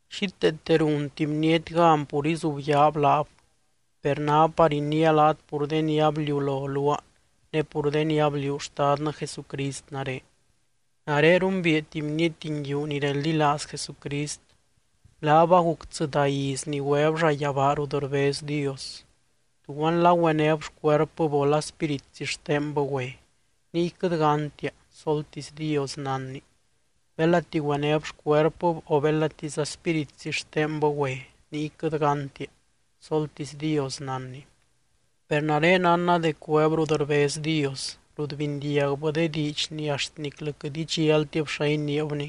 Xíteete runti bniety gan pur izubyaab laab, per ná par iniia laat pur de ni abliulo luaa ne pur de ni abliuu Xtadnɨ Jesucrist nare. Nare rumbiia tuby bniety nguiu ni reldilaaz Jesucrist, laab aguc tsɨdá iz ni güeb llayabaa rut rbez Dios. (Tuguanla güenéb xcuerpɨb o la spíritzi xtenbɨ güe, niy quɨt gántia, soltisy Dios nánny.) Belati güenéb xcuerpɨb o belatiza spíritzi xtenbɨ güe, niy quɨt gántia, soltisy Dios nánny. Per nare nánna dec güeb rut rbez Dios, rut bindiagbɨ de diidx ni axt niclɨ quɨt idxialtib xa iniibni,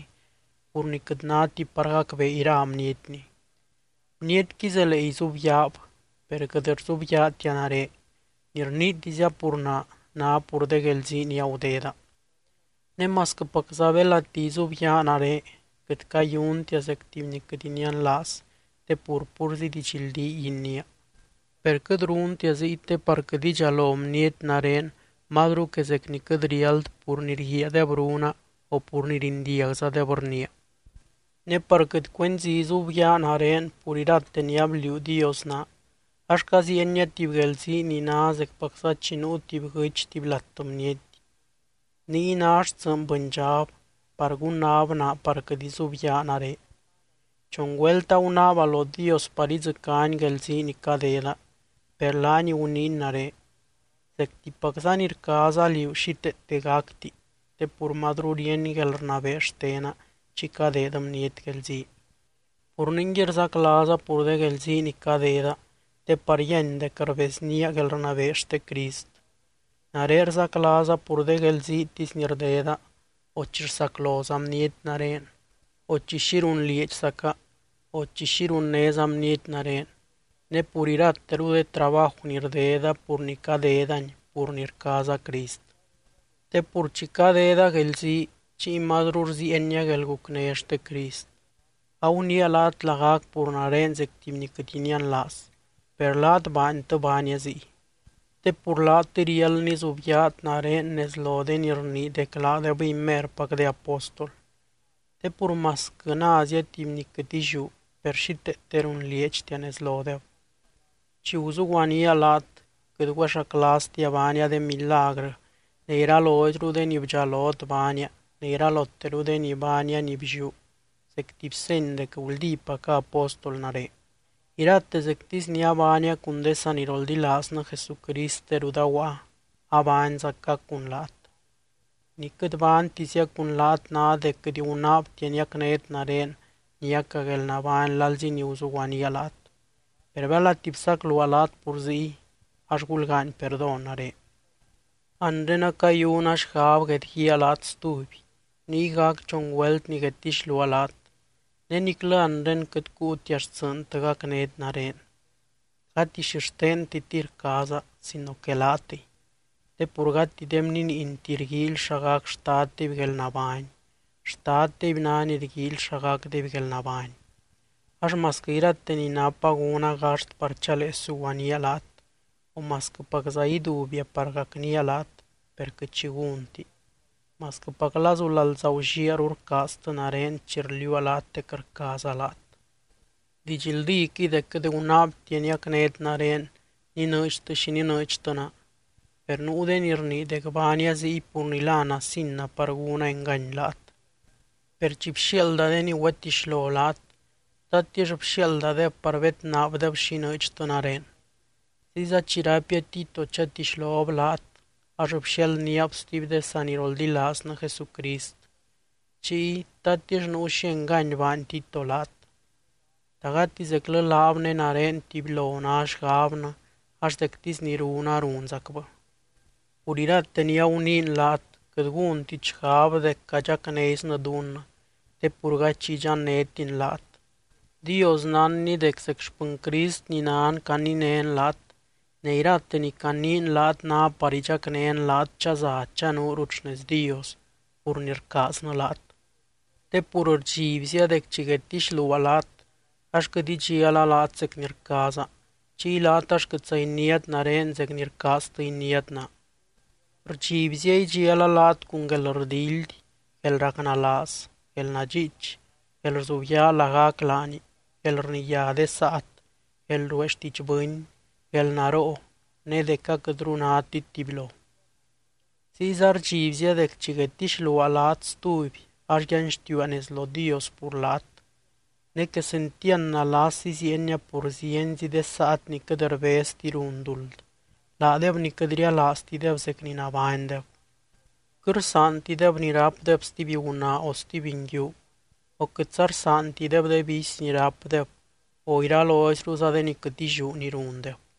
pur ni quɨt náti par gacbee ira bnietni. Bnietqui zelee izubyaab, per quɨt rzubyaatia nare, ni rniitizia pur naa, ná pur de guelzii ni agudeda. Ne masquɨpacza belati izubyaa nare, quɨt cayuntia zec tuby ni quɨt inianlaaz te pur púrzi didxldíy iniia. Per quɨt runtia ziy te par quɨt idxalo bniety nare mazru que zec ni quɨt riáld pur ni rguiaadeb runa, o pur ni rindiagzadeb rniia. Ne par quɨt cuenzi izubyaa nare pur irate ni abliuu Dios naa, ax caziienia tuby guelzii ni ná zecpacza chi nuu tuby guɨ́ch tuby lat bniety. Niy ná xtsɨɨny bɨndxab par gunnab naa par quɨt izubyaa nare. Chon güelt agunaaba lo Dios par idzɨcány guelzii ni cadeda, per laany guniiny nare: “Zectipac ni rcaaza liú xíteete gacti, te pur mazru ríeny guelrnabee xtena chi cadeed bniety guelzii.” Pur ningui rzaclaaza pur de guelzii ni cadeda te par yíany dec rbeznía guelrnabee xte Crist. Nare rzaclaaza pur de guelziitisy ni rdeda, o chi rsacloza bniety nare, o chi xi runlieedxzaca, o chi xi runnéza bniety nare, ne pur irateru de trabaju ni rdeda pur ni cadedani pur ni rcaaza Crist. Te pur chi cadeda guelzii chiy mazru rziienia guelgucné xte Crist. Aguniia laat lagac pur nare zec tuby ni quɨt inianlaaz, per laat baantɨ baania ziy. Te pur laatɨy riáld nizubyaat nare nez lo de ni rnii dec laadebɨy merpac de apóstol. Te pur masquɨ názia tuby ni quɨt illiú, per xíteete runlieedxtia nez lodeb. Chi guzuguanía laat quɨt güexaclaaztia baania de milagrɨ ne iraloizru de ni bdxalot baania ne iraloteru de ni baania ni blliú zec tuby seny dec guldípaca apóstol nare. Irate zectisy ni abaania cun de saniroldilaaznɨ Jesucrist de rut aguaa, abaanzaca cun laat. Ni quɨt baantizia cun laat ná dec quɨt gunaabtia niacnét nare niaca guelnabány lalzi ni guzuguaníaa laat. Per belati bsacluaa laat pur ziy ax, ¡gulgaany perdón nare! Anre acayuna xgab guedguíaa laat stuby, niy gac chon güelt ni guedtixluaa laat. Ne niclɨ anre quɨt cuutia xtsɨɨntɨ gacnét nare, gati xixtentitɨy rcaaza sino que laatɨy. Te pur gati de bniniinti rguíily xa gac xtaddeby guelnabány, xtaddeby ná ni rguíily xa gacdeby guelnabány. Ax masquɨ irate ni napa gúna gaxt par chalee suguaníaa laat, o masquɨpacza ídubia par gacnía laat, per quɨt xi gúnti. Masquɨpac lazu lalza gulliaru rcaaztɨ nare chi rliuua laat dec rcaaza laat. Didxldíquɨy dec quɨt gunaabtia niacnét nare ninɨɨdxtɨ xi ninɨɨdxtɨ naa, per nuu de ni rnii dec baania ziy pur ni la nasina par gúna engany laat. Per chi bxiaalda de ni güetixlo laat, ¿tatix bxiaaldadeb par bednaabdeb xi inɨɨdxtɨ nare? Ziyza chi raipia Tito chatixlob laat ax bxialdníab stuby de saniroldilaaznɨ Jesucrist chiy, ¿tatix nuu xi engany baany Tito laat? ¿Ta gati zeclɨ laab ne nare tubylo ná xgabnɨ ax zectisy ni runa, runzacbɨ? Pur irate ni aguniin laat, quɨt gúntit xgab dec cadxacnézinɨ dunnɨ, te pur gady xi idxannétin laat. Dios nánny dec zec xpɨny Crist ni nan caninén laat, ne irate ni caniin laat ná par idxacnén laat chaza chanuurut xnez Dios pur ni rcaaznɨ laat. Te pur rdxibzia dec chi guedtixluaa laat ax quɨt idxiala laat zec ni rcaaza, chiy laat ax quɨtza iniátit nare zec ni rcaaztɨ iniát naa. Rdxibzia idxiala laat cun guelrdildy, guelracnalaaz, guelnadxiich, guelrzubyaa lagac laani, guelrniyá de saat, guelruee xtiidx bɨny, guelnaroo ne dec aquɨtru nátit tubylo. Ziyza rdxibzia dec chi guedtixluaa laat stuby ax yanxtiua nez lo Dios pur laat. Ne quesentiand nalas iziienia pur zienzi de saat ni quɨt rbezti run duld, laadeb ni quɨt rialaaztideb zec ni nabánydeb. Quɨt rsaantideb ni rápdeb stuby gunaa o stuby nguiu, o quɨtza rsaantideb de vicy ni rápdeb o iraloizruza de ni quɨt illiú ni rundeb.